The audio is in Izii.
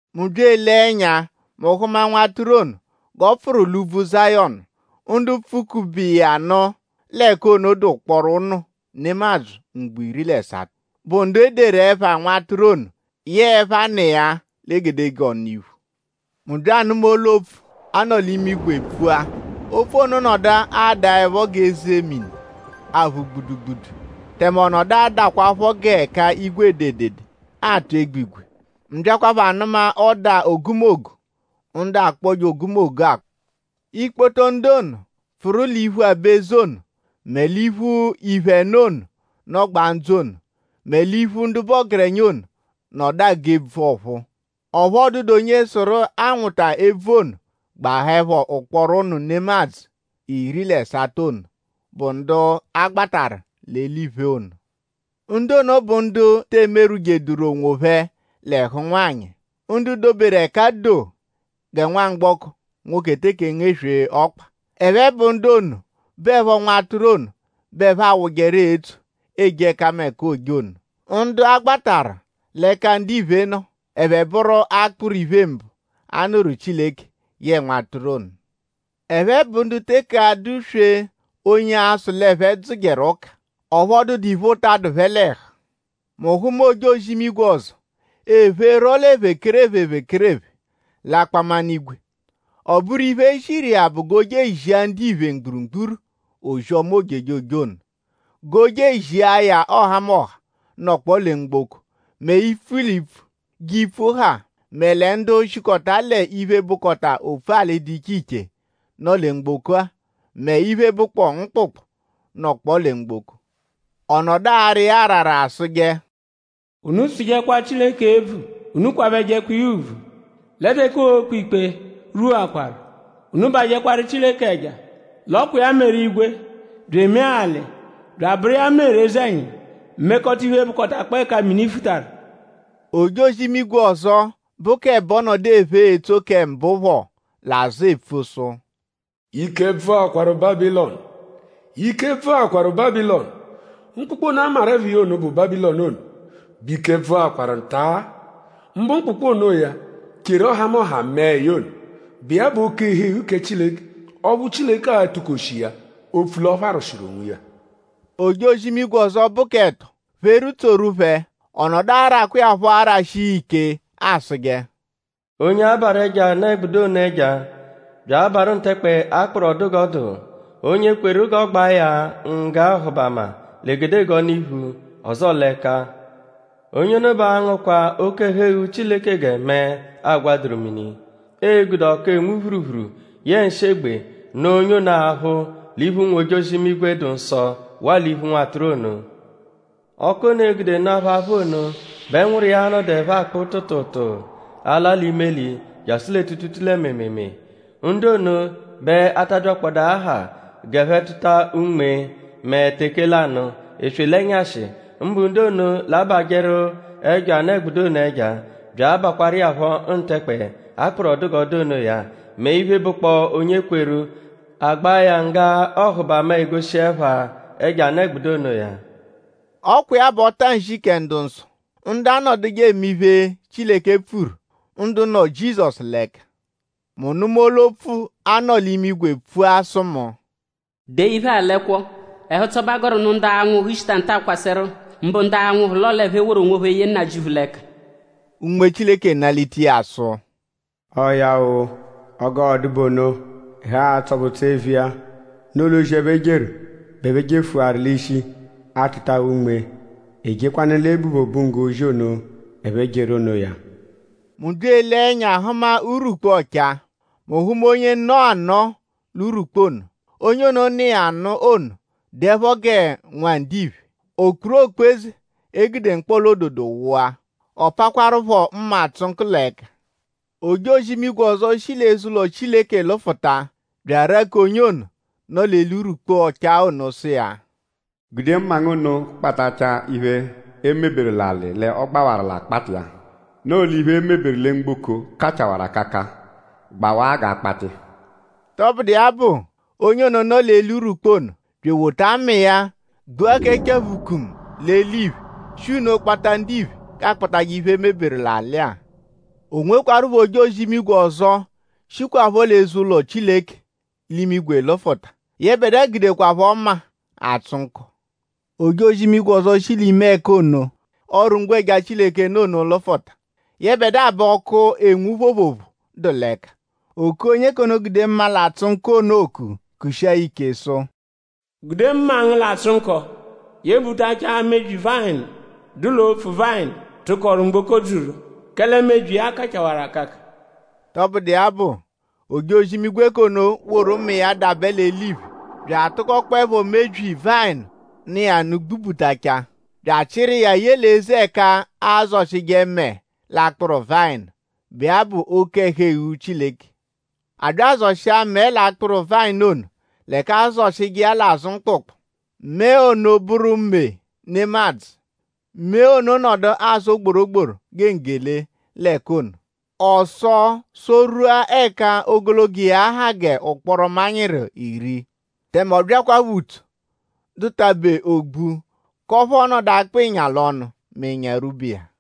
Mu bya elee ẹnya; mu hụma Nwatụru ono g'ọ pfụru l'úbvú Zayọnu. Ndu pfụ-kube iya nụ l'ẹka ono dụ ụkporo ụnu nemadzụ mgbo iri l'ẹsato, bụ ndu e deru ẹpha Nwatụru ono yẹe ẹpha Nna iya l'egedegee ọnu-iphu. Mu bya anụma olu-opfu, a nọ l'imigwe pfua. Opfu ono nọdu adaẹpho g'ẹka eze mini aphụ gbudugbudu; tẹme ọ nọdu adahụkwapho g'ẹka igwe ede edede atụ egbigwe. Mu byakwaphọ anụma ọda ogumogu ndu akpọje ogumogu akpọ. Ikpoto ndu ono, pfụru l'iphu aba-eze ono mẹ l'iphu iphe ẹno ono, nọgbaa ndzụ ono; mẹ l'iphu ndu bụ ọgerenya ono; nọdu agụ ebvu ọ̀phúú. Ọphu ọ dụdu onye sụru anwụta ebvu ono gbahaẹpho ụkporo ụnu nemadzụ iri l'ẹsato ono, bụ ndu a gbatarụ l'eliphe ono. Ndu ono bụ ndu te emerwụjeduru onwophẹ l'ẹhu ụnwanyi. Ndu doberu ẹka doo gẹ nwamgbọko, nwoke teke engeswee ọkpa. Ẹphe bụ ndu ono, bụepho Nwatụru ono bẹ ẹphe awụjeru etso eje ẹkameka, ooje ono. Ndu a gbatarụ l'ẹka ndiphe nọ; ẹphe bụru akpụru iphe-mbụ a nụru Chileke yẹe Nwatụru ono. Ẹphe bụ ndu teke adụ-swee onye a-sụ l'ẹphe dzụjeru ụka. Ọphu ọ dụdu iphe ụta, dụ phẹ l'ẹhu. Mu hụma ojozi-imigwe ọzo, epherọ ephekerephe ephekerephe l'akpaminigwe. Ọ bụru iphe, e ziru iya bụ g'o je ezia ndiphe mgburugburu ozi-ọma ojejoje ono; g'o je ezia ya ọhamoha, nọkpoo lẹ mgboko; mẹ ipfu l'ipfu g'ipfu ha; mẹ lẹ ndu shikọta l'iphe, bụkota opfu-alị ndu dụ iche l'iche, nọ lẹ mgboko-a; mẹ iphe, bụkpoo mkpụkpu, nọkpo lẹ mgboko. Ọ nọdu ara iya arara asụje: “Unu tsụjekwa Chileke ebvu. Unu kwabẹjekwa iya ùbvù; lẹ teke oo-kpe ikpe rwuakwaru. Unu bajẹkwaru Chileke ẹja; l'ọ kwa iya meru igwe bya emee alị; bya abụru iya meru eze-ẹnyimu; mekọta iphe, bụkotakpoo ẹka mini futaru.” Ojozi-imigwe ọzo, bụ k'ẹbo nọdu ephe etso kẹ mbụ phọ l'azụ epfu sụ: “Ike bvụakwaru Bábilọnu! Ike bvụakwaru Bábilọnu! Mkpụkpu ono, a maru ẹpha iya ono, bụ Bábilọnu bẹ ike bvụakwaru nta. Mbụ mkpụkpu onoya, cheru ọhamoha mẹe ya ono, bụ iya bụ oke-ẹhu-eghu kẹ Chileke ọphu Chileke a-tụ-koshi iya; opfu l'ọopharwushi onwiya.” Ojozi-imigwe ọzo, bụ k'ẹto pheru tsoru phẹ. Ọ nọdu arakwa iya phọ arashi iya ike asụje: “Onye abarụ ẹjo anụ-ẹgbudu ono ẹja; bya abarụ ntẹkpe, a kpụru ọ dụ g'ọ dụ; onye kweru g'ọ gbaa ya ngga ọhubama l'egedegee ọnu-iphu; ọzoo l'ẹka; onye ono bẹ a-ngụkwa oke-ẹhu-eghu Chileke gẹ mẹe, aagwaduru mini. Ee-gude ọku, enwu phuruphuru yẹe nshị-egbe nụa onye ono aphụ l'iphu ụnwu-ojozi-imigwe, dụ nsọ; waa l'iphu Nwatụru ono. Ọku ono, ee-gude nụa phẹ aphụ ono bẹ ẹnwuru iya a-nọduepho akpụ tụutuutuu ala l'imeli jasụ lẹ tuutuutuu lẹ mịimiimii. Ndu ono bẹ a ta abyakpọda aha g'ẹphe tụta unme mẹ teke lanụ; eswe l'ẹnyashi; mbụ ndu ono, l'abajẹru ẹjo anụ-ẹgbudu ono ẹja; bya abakwaru iya phọ ntẹkpe, a kpụru ọ dụ g'ọ dụ onoya; mẹ iphe, bụkpoo onye kweru: a gbaa ya ngga ọhubama, egoshi ẹpha ẹjo anụ-ẹgbudu onoya.” Ọ kwa iya bụ ọta-nshi kẹ ndu-nsọ; ndu anọduje eme iphe, Chileke pfuru; ndu nọ Jizọsu l'ẹka. Mu nụma olu-opfu, a nọ l'imigwe pfua sụ mu: “Dee iphe-a l'ẹkwo. Ẹhu-ụtso bẹ a gọru nụ ndu a-nwụhu shita nta-a kwasẹru; mbụ ndu a-nwụhu l'ọo l'ẹphe woru onwophẹ ye Nnajịuphu l'ẹka.” Unme Chileke nalita iya sụ: “Ọo ya-o! Ọo g'ọ dụ bụ ono. Ẹhu a-tsọ phẹ ụtso eviya; noo l'ozi, ẹphe jeru bẹ ẹphe jefụwaru l'ishi; atụtawa unme; e jekwanụ l'ebu phẹ obunggo ozi ono, ẹphe jeru onoya.” Mu bya elee ẹnya hụma urwukpu ọchaa. Mu hụma onye nọ anọo l'urwukpu ono. Onye ono, nọ iya nụ ono dụepho gẹ nwa ndiphe. O kpuru okpu-eze, e gude mkpọla-ododo wụa; ọ pakwarụ phọ mma, atsụ nkọ l'ẹka. Ojozi-imigwe ọzo, shi l'eze-ụlo Chileke lụfuta bya araku onye ono, nọ l'eli urwukpu ọchaa ono sụ iya: “Gude mma ngu ono kpatachaa iphe, e meberu l'alị l'ọ gbawaru l'akpakpa iya. Noo l'iphe, e meberu lẹ mgboko kachawarụ akaka gbawaa g'aakpata iya.” Tọbudu iya bụ; onye ono, nọ l'eli urwukpu ono bya ewota mma iya gbua kẹ chaphukumu l'eliphe; shi nno kpata ndiphe g'aakpajẹ iphe, e meberu l'alị-a. O nwekwarụpho ojozi-imigwe ọzo, shikwaphọ l'eze-ụlo Chileke l'imigwe lụfuta. Yẹbedua gudekwaphọ mma, atsụ nkọ. Ojozi-imigwe ọzo shi l'ime ẹka ono, ọru-ngwẹja Chileke nọ ono lụfuta. Yẹbedua bẹ ọku enwu phoophoophoo dụ l'ẹka. O kua onye k'ono, gude mma, l'atsụ nkọ ono oku; kushia ya ike sụ: “Gude mma ngu, l'atsụ nkọ yebutachaa mebyi vayịnu, dụ l'opfu-vayịnu, tụkoru mgboko dzuru; kẹle mebyi iya kachawarụ akaka!” Tọbudu iya bụ; ojozi-imigwe ono woru mma iya dabẹ l'eliphe bya atụkokpoepho mebyi vayịnu nọ iya nụ gbubutachaa bya achịru iya ye l'eze ẹka, aazọshije mẹe l'akpụru vayịnu, bụ iya bụ oke-ẹhu-eghu Chileke. A bya azọshia mẹe l'akpụru vayịnu ono l'ẹka aazọshije iya l'azụ mkpụkpu. Mẹe ono bụru mee nemadzụ. Mee ono nọdu asọ gborogboro gẹ nggele l'ẹka ono. Ọ sọo sọ-rwua ẹka ogologo iya ha g'ụkporo manyịru iri. Tẹme ọ byakwaphọ utso, dụ-tabe ogbu; k'ọphu ọo-nọdu akpa ịnya l'ọnu mẹ ịnya rwuba iya.